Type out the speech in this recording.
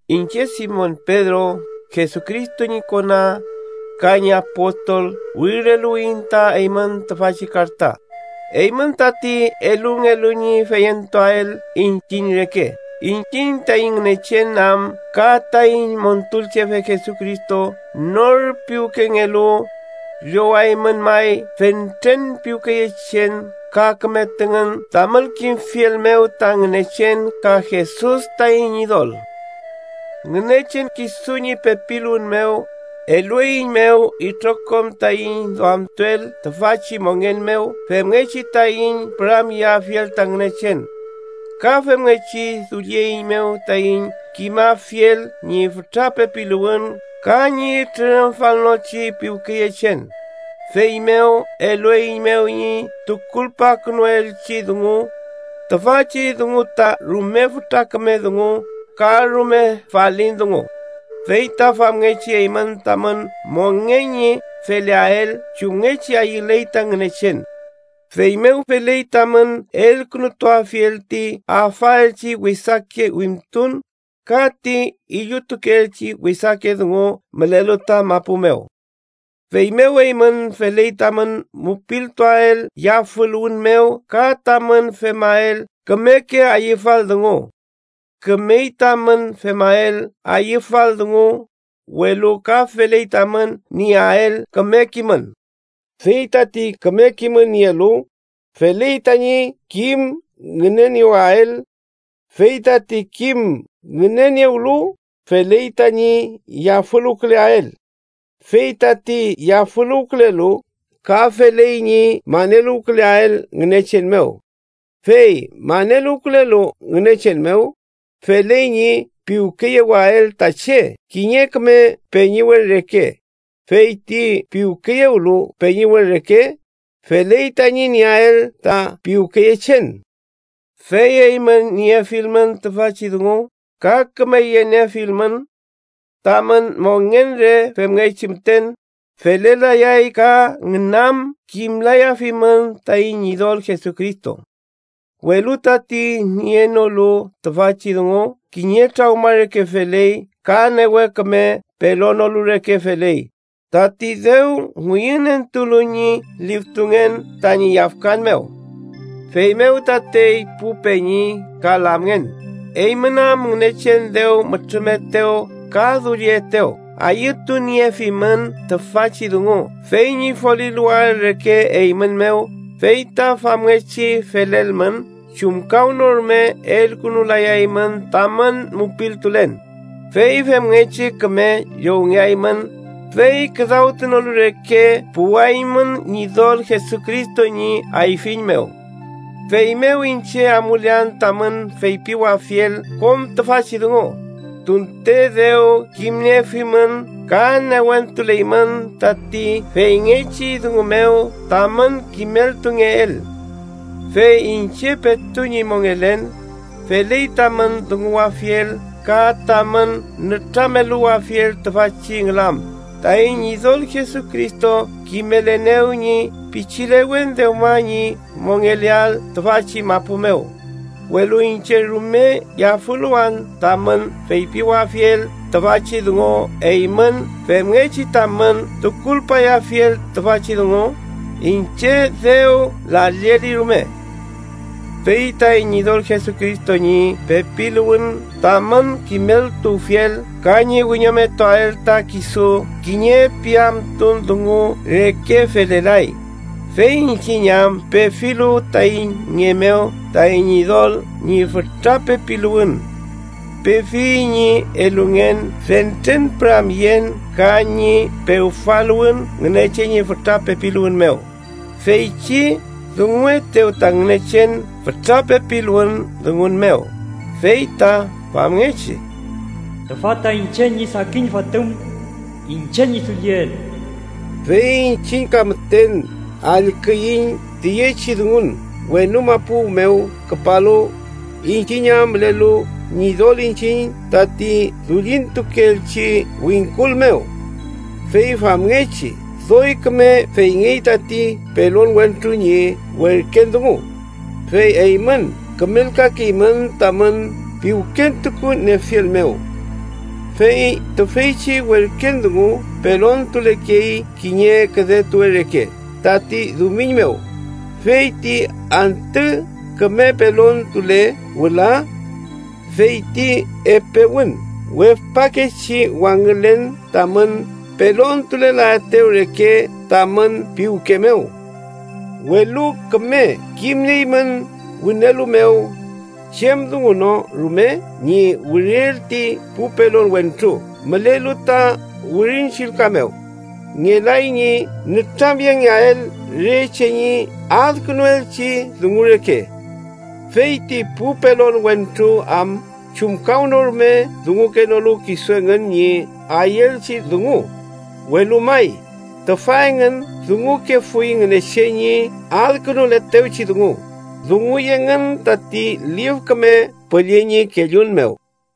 Iñche Simon Pedro, Jesucristo ñi kona ka ñi apostol, wirileluwiyiñ ta eymün tüfachi karta, eymün tati elungelu ñi feyentuael iñchiñ reke, iñchiñ taiñ Ngünechen am ka taiñ Montulchefe Jesucristo nor piwkengelu. Llowaymün may fentren piwkeyechen ka küme tüngün tamün kimfiel mew ta Ngünechen ka Jesus taiñ Ñidol. Ngünechen kisu ñi pepiluwün mew, elueiñmew itrokom taiñ duamtuel tüfachi mongen mew femngechi taiñ püramyeafiel ta Ngünechen. Ka femngechi dullieiñmew taiñ kimafiel ñi fütra pepiluwün ka ñi trürümfalnochi piwkeyechen. Feymew, elueiñmew ñi tukulpakünuelchi dungu, tüfachi dungu ta rume fütra küme dungu ka rume falin dungu, fey ta famngechi eymün tamün mongen ñi feleael chumngechi ayüley ta Ngünechen. Feymew feley tamün elkünutuafiel ti afaelchi wesake wimtun ka ti illutukeelchi wesake dungu mülelu ta mapu mew. Feymew eymün feley tamün mupiltuael yafüluwün mew ka tamün femael kümeke ayüfal dungu. Kümey tamün femael ayüfal dungu, welu ka feley tamün nieael küme kimün. Fey tati küme kimün nielu, feley tañi kim ngüneniewael. Fey tati kim ngüneniewlu, feley tañi yafüluwküleael. Fey tati yafüluwkülelu, ka feley ñi maneluwküleael Ngünechen mew. Fey maneluwkülelu Ngünechen mew, feley ñi piwkeyewael ta che kiñe küme peñiwen reke, fey ti piwkeyewlu peñiwen reke, feley tañi nieael ta piwkeyechen. Fey eymün niefilmün tüfachi dungu ka küme yeniefilmün, tamün mongen re femngechi müten felelayay ka ngünam kimlayafimün taiñ Ñidol Jesucristo. Welu tati nienolu tüfachi dungu kiñe trawma reke feley ka newe küme pelonolu reke feley, tati dew ngüyünentulu ñi liftungen tañi yafkan mew. Feymew tatey pu peñi ka lamngen, eymün am Ngünechen dew mütrümetew ka dullietew, ayütuniefimün tüfachi dungu fey ñi foliluwael reke eymün mew, fey ta famngechi felelmün, chumkawnorume elkünulayaymün tamün mupiltulen. Fey femngechi küme llowngeaymün fey küdawtunolu reke puwaymün Ñidol Jesucristo ñi ayfiñ mew. Feymew iñche amulean tamün feypiwafiel kom tüfachi dungu, tunte dew kimniefimün ka newentuleymün tati feyngechi dungu mew tamün kimeltungeel. Fey iñche petu ñi mongelen, feley tamün dunguwafiel ka tamün nütrameluwafiel tüfachi ngülam. Taiñ Ñidol Jesucristo kimelenew ñi pichilewen dewma ñi mongeleael tüfachi mapu mew. Welu iñche rume yafüluwan tamün feypiwafiel tüfachi dungu eymün femngechi tamün tukulpayafiel tüfachi dungu, iñche dew lalleli rume. Fey taiñ Ñidol Jesucristo ñi pepiluwün tamün kimeltuwfiel ka ñi wiñometuael ta kisu kiñe piamtun dungu reke felelay, fey iñchiñ am pefilu taiñ nge mew taiñ Ñidol ñi fütra pepiluwün. Pefiyiñ ñi elungen fentren püramyen ka ñi pewfaluwün Ngünechen ñi fütra pepiluwün mew, feychi dunguetew ta Ngünechen fütra pepiluwün dungun mew, fey ta famngechi: “Tüfa ta iñche ñi sakin Fotüm, iñche ñi dulliel.” Fey iñchiñ ka müten allküiñ tüyechi dungun wenu mapu mew küpalu, iñchiñ am mülelu Ñidol iñchiñ tati dullintuelchi wingkul mew. Fey famngechi doy küme feyngey tati pelon wentru ñi werken dungu, fey eymün kümelkakeymün tamün piwkentukuniefiel mew. Fey tüfeychi werken dungu pelontulekey kiñe küdetuwe reke tati dumiñ mew, fey ti antü küme pelontule wüla feyti epewün wefpakechi wangülen tamün pelontulelaetew reke tamün piwke mew. Welu küme kimnieymün wünelu mew, chem dungu no rume ñi wiriel ti pu pelon wentru mülelu ta Wirin Chillka mew, ngelay ñi nütramyengeael re che ñi adkünuelchi dungu reke. Fey ti pu pelon wentru am chumkawnorume dungunolu kisu engün ñi ayüelchi dungu: welu may, tüfa engün dungukefuy Ngünechen ñi adkünuletewchi dungu, dunguy engün tati Lif Küme Püllü ñi kellun mew.